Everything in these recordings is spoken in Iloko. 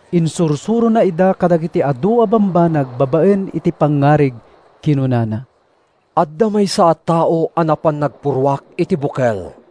Insursurona ida kadagiti adu a bambanag babaen iti pangngarig. Kinunana: “Adda maysa a tao a napan nagpurruak iti bukel.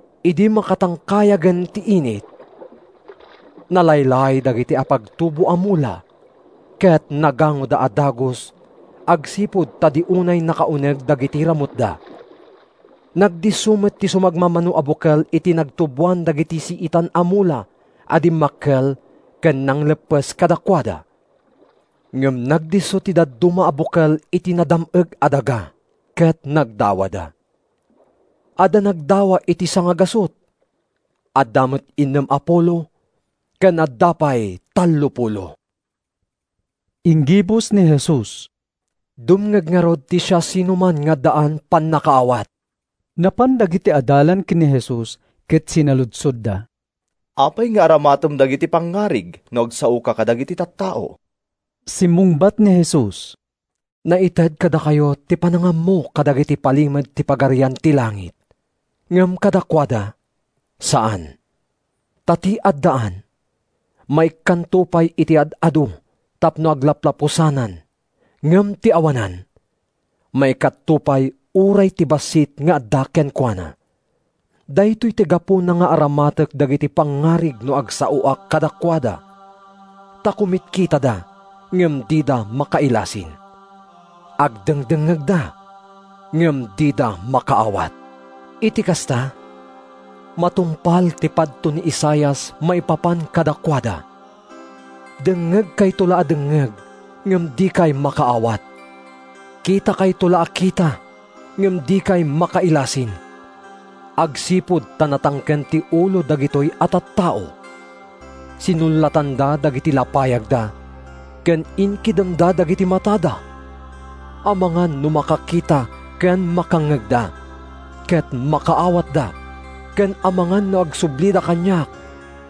Idi makatangkayagen ti init, nalaylay dagiti apagtubo a mula ket nagangoda a dagus agsipud ta di unay nakauneg dagiti ramutda. Nagdisso met ti sumagmamano a bukel iti nagtuboan dagiti siitan a mula a dimmakkel ken nangleppes kadakuada. Ngem nagdisso ti dadduma a bukel iti nadam-eg a daga, ket nagdawada: adda nagdawa iti sangagasut, adda met innem a pulo ken adda pay tallopulo.” Inggibus ni Jesus, “Dumngeg ngarud ti siasinoman nga addaan pannakaawat!” Napan dagiti adalan ken ni Jesus ket sinaludsodda, “Apay nga aramatem dagiti pangngarig no agsaoka kadagiti tattao?” Simmungbat ni Jesus, “Naited kadakayo ti panangammo kadagiti palimed ti Pagarian ti Langit, ngem kadakuada, saan. Ta ti addaan, maikkanto pay iti ad-adu tapno aglaplapusanan ngem ti awanan, maikkatto pay uray ti bassit nga adda kenkuana. Daytoy ti gapuna nga aramatek dagiti pangngarig no agsaoak kadakuada: ta kumitkitada ngem dida makailasin, agdengdengngegda ngem dida makaawat. Iti kasta, matungpal ti padto ni Isaias maipapan kadakuada: ‘Dengngegkayto la a dengngeg ngem dikay makaawat; Kitakayto la a kita ngem dikay makailasin. Agsipud ta natangken ti ulo dagitoy a tattao, Sinullatanda dagiti lapayagda, Ken inkidemda dagiti matada, Amangan no makakita ken makangngegda, ket makaawatda, Ken amangan no agsublida kaniak,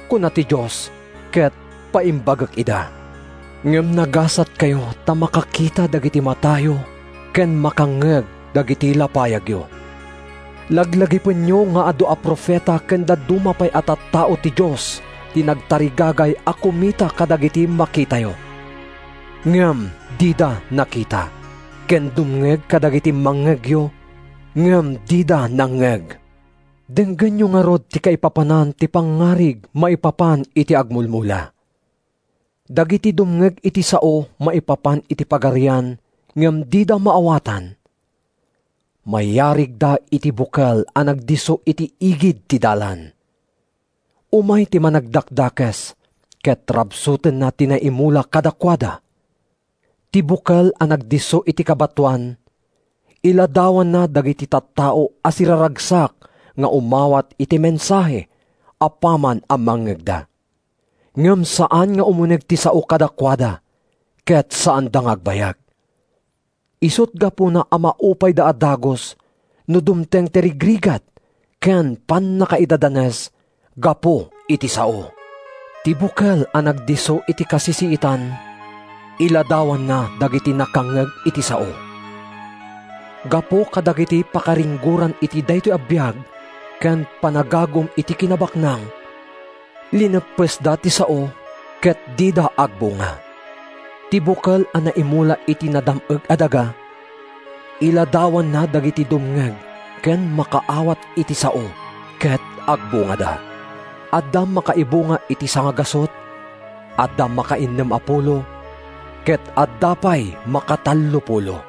kuna ti Dios, Ket paimbagek ida.’ “Ngem nagasatkayo ta makakita dagiti matayo ken makangngeg dagiti lapayagyo! Laglagipenyo nga adu a profeta ken dadduma pay a tattao ti Dios ti nagtarigagay a kumita kadagiti makitayo, ngem dida nakita, ken dumngeg kadagiti mangngegyo, ngem dida nangngeg.” “Denggenyo ngarud ti kaipapanan ti pangngarig maipapan iti agmulmula: “Dagiti dumngeg iti sao maipapan iti Pagarian ngem dida maawatan, mayarigda iti bukel a nagdisso iti igid ti dalan. Umay ti Managdakdakes ket rabsutenna ti naimula kadakuada. Ti bukel a nagdisso iti kabatoan iladawanna dagiti tattao a siraragsak nga umawat iti mensahe apaman a mangngegda. Ngem saan nga umuneg ti sao kadakuada ket saanda nga agbayag. Isut’ gapuna a maupayda a dagus no dumteng ti rigrigat ken pannakaidadanes gapu iti sao. Ti bukel a nagdisso iti kasisiitan iladawanna dagiti nakangngeg iti sao. Gapu kadagiti pakaringgoran iti daytoy a biag ken ti panagagum iti kinabaknang, lineppesda ti sao ket dida agbunga. Ti bukel a naimula iti nadam-eg a daga iladawanna dagiti dumngeg ken makaawat iti sao ket agbungada; adda makaibunga iti sangagasut, adda makainnem a pulo ket adda pay makatallopulo.”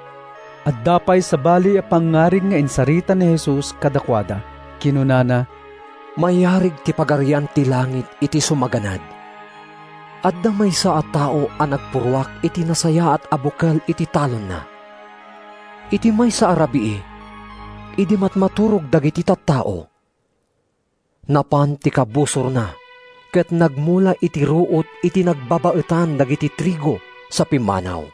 Adda pay sabali a pangngarig nga insarita ni Jesus kadakuada. Kinunana: “Mayarig ti Pagarian ti Langit iti sumaganad: Adda maysa a tao a nagpurruak iti nasayaat a bukel iti talonna. Iti maysa a rabii, idi matmaturog dagiti tattao, napan ti kabusorna ket nagmula iti ruot iti nagbabaetan dagiti trigo, sa pimmanaw.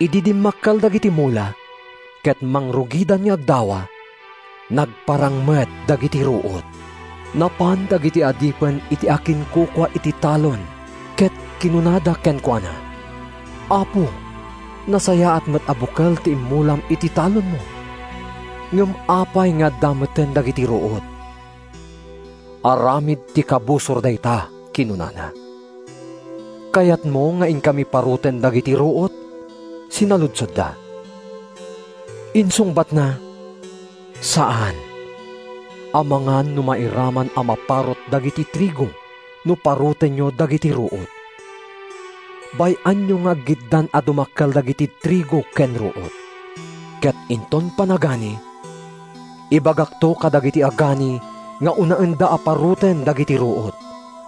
Idi dimmakkel dagiti mula, ket mangrugidan nga agdawa, nagparang met dagiti ruot. Napan dagiti adipen iti akinkukua iti talon ket kinunada kenkuana. ‘Apo, nasayaat met a bukel ti immulam iti talonmo; ngem apay nga adda metten dagiti ruot?’ “ ‘Aramid ti kabusor dayta,’ kinunana. “ ‘Kayatmo nga inkami paruten dagiti ruot?’ sinaludsodda. “Insungbatna, ‘Saan, amangan no mairaman a maparut dagiti trigo no parutenyo dagiti ruot. Bay-anyo nga aggiddan a dumakkel dagiti trigo ken ruot. Ket inton panagani, ibagakto kadagiti agani nga unaenda a paruten dagiti ruot,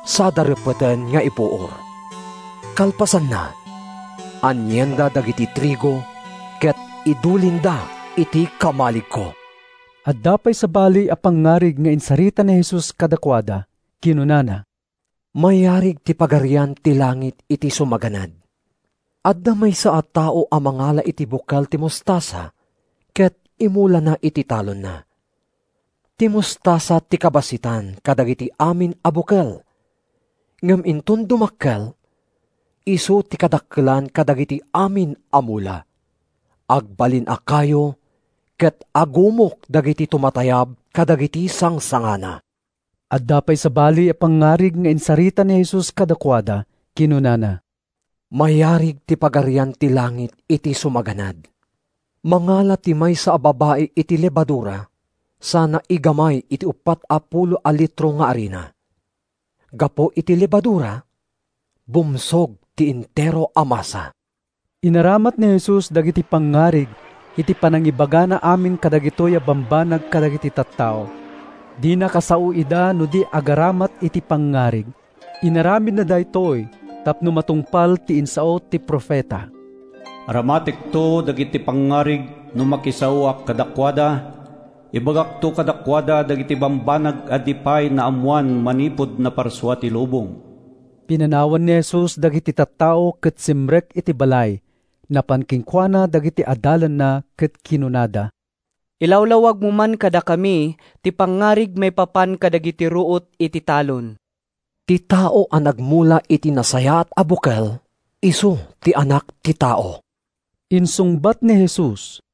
sada reppeten nga ipuor. Kalpasanna, anienda dagiti trigo ket idulinda iti kamaligko.’” Adda pay sabali a pangngarig nga insarita ni Jesus kadakuada. Kinunana: “Mayarig ti Pagarian ti Langit iti sumaganad: Adda maysa a tao a mangala iti bukel ti mostasa ket imulana iti talonna. Ti mostasa ti kabassitan kadagiti amin a bukel, ngem inton dumakkel, isu ti kadakkelan kadagiti amin a mula. Agbalin a kayo ket agumok dagiti tumatayab kadagiti sangsangana.” Adda pay sabali a pangngarig nga insarita ni Jesus kadakuada. Kinunana, “Mayarig ti Pagarian ti Langit iti sumaganad: Mangala ti maysa a babai iti lebadura sana igamay iti uppat a pulo a litro nga arina. Gapu iti lebadura, bumsog ti entero a masa.” Inaramat ni Jesus dagiti pangngarig iti panangibagana amin kadagitoy a bambanag kadagiti tattao. Dina kasao ida no di agaramat iti pangngarig. Inaramidna daytoy tapno matungpal ti insao ti profeta: “Aramatekto dagiti pangngarig no makisaoak kadakuada; Ibagakto kadakuada dagiti bambanag a di pay naammoan manipud naparsua ti lubong.” Pinanawan ni Jesus dagiti tattao ket simrek iti balay. Napan kenkuana dagiti adalanna ket kinunada, “Ilawlawagmo man kadakami ti pangngarig maipapan kadagiti ruot iti talon.” “Ti tao a nagmula iti nasayaat a bukel isu ti Anak ti Tao,” insungbat ni Jesus.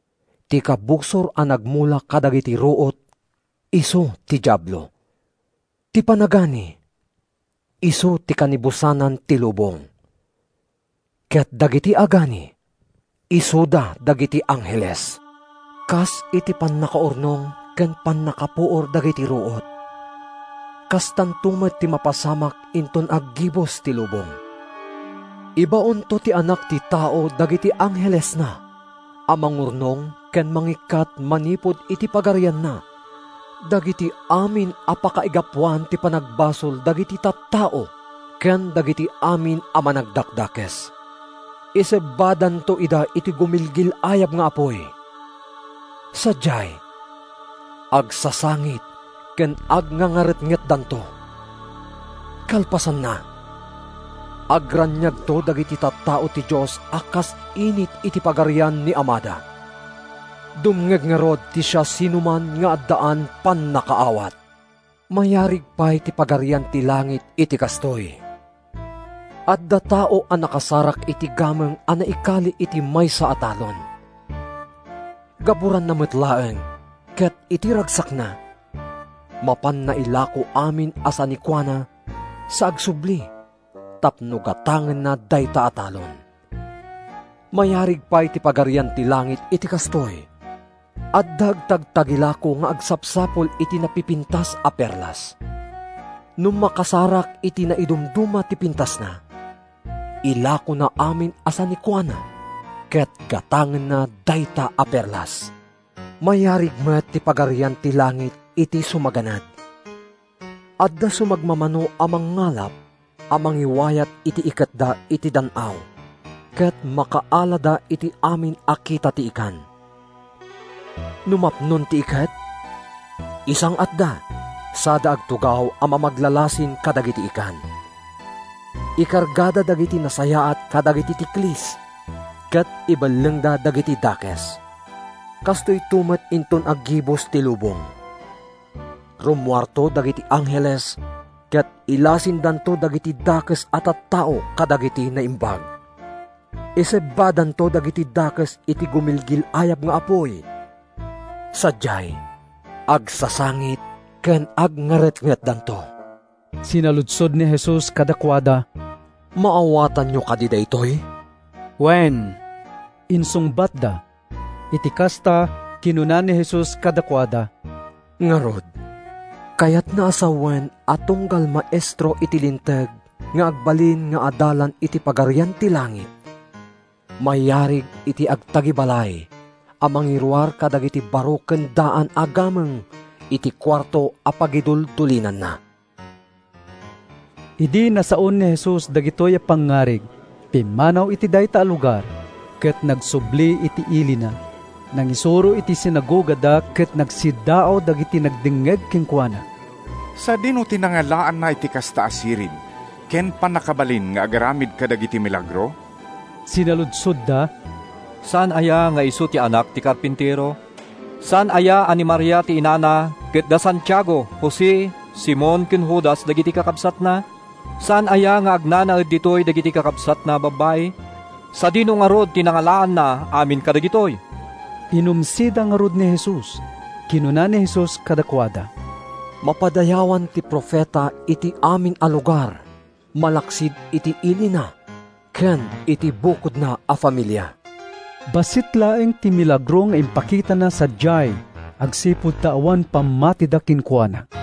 Ti kabusor a nagmula kadagiti ruot isu ti Diablo. Ti panagani isu ti kanibusanan ti lubong, ket dagiti agani isuda dagiti angheles. Kas iti pannakaurnong ken pannakapuor dagiti ruot, kastanto met ti mapasamak inton aggibus ti lubong. Ibaonto ti Anak ti Tao dagiti anghelesna a mangurnong ken mangikkat manipud iti Pagarianna dagiti amin a pakaigapuan ti panagbasol dagiti tattao ken dagiti amin a managdakdakes. Isebbadanto ida iti gumilgil-ayab nga apuy. Sadiay, agsasangit ken agngangaretngetdanto. Kalpasanna, agraniagto dagiti tattao ti Dios a kas init iti Pagarian ni Amada. Dumngeg ngarud ti siasinoman nga addaan pannakaawat.” “Mayarig ti Pagarian ti Langit iti kastoy: Adda tao a nakasarak iti gameng a naikali iti maysa a talon. Gaburanna met laeng ket iti ragsakna, mapanna ilako amin a sanikuana sa agsubli tapno gatangenna dayta a talon.” “Mayarig pay ti Pagarian ti Langit iti kastoy: Adda agtagtagilako nga agsapsapul iti napipintas a perlas. No makasarak iti naidumduma ti pintasna, ilakona amin a sanikuana ket gatangenna dayta a perlas.” “Mayarig met ti Pagarian ti Langit iti sumaganad: Adda sumagmamano a mangngalap a mangiwayat iti iketda iti dan-aw ket makaalada iti amin a kita ti ikan. No mapnon ti iket, isang-atda sada agtugaw a mamaglalasin kadagiti ikan. Ikargada dagiti nasayaat kadagiti tiklis ket ibellengda dagiti dakes. Kastoyto met inton aggibus ti lubong. Rummuarto dagiti angheles ket ilasindanto dagiti dakes a tattao kadagiti naimbag. Isebbadanto dagiti dakes iti gumilgil-ayab nga apuy. Sadiay, agsasangit ken agngaretngetdanto.” Sinaludsod ni Jesus kadakuada, “Maawatanyo kadi daytoy?” “Wen,” insungbatda. Iti kasta, kinuna ni Jesus kadakuada, “Ngarud, kayatna a sawen a tunggal maestro iti Linteg nga agbalin nga adalan iti Pagarian ti Langit, mayarig iti agtagibalay a mangiruar kadagiti baro ken daan a gameng iti kuarto a pagiduldulinanna.” Idi nasaon ni Jesus dagitoy a pangngarig, pimmanaw iti dayta a lugar, ket nagsubli iti ilina. Nangisuro iti sinagogada ket nagsiddaaw dagiti nagdengngeg kenkuana. “Sadino ti nangalaanna iti kasta a sirib ken pannakabalin nga agaramid kadagiti milagro?” sinaludsodda. “Saan aya nga isu ti anak ti karpintero? Saan aya a ni Maria ti inana ket da Santiago, Jose, Simon ken Judas dagiti kakabsatna? Saan aya nga agnanaed ditoy dagiti kakabsatna a babbai? Sadino ngarud ti nangalaanna amin kadagitoy?” Inumsida ngarud ni Jesus. Kinuna ni Jesus kadakuada, “Mapadayawan ti profeta iti amin a lugar malaksid iti ilina ken iti bukodna a familia.” Bassit laeng ti milagro nga impakitana sadiay agsipud ta awan pammatida kenkuana.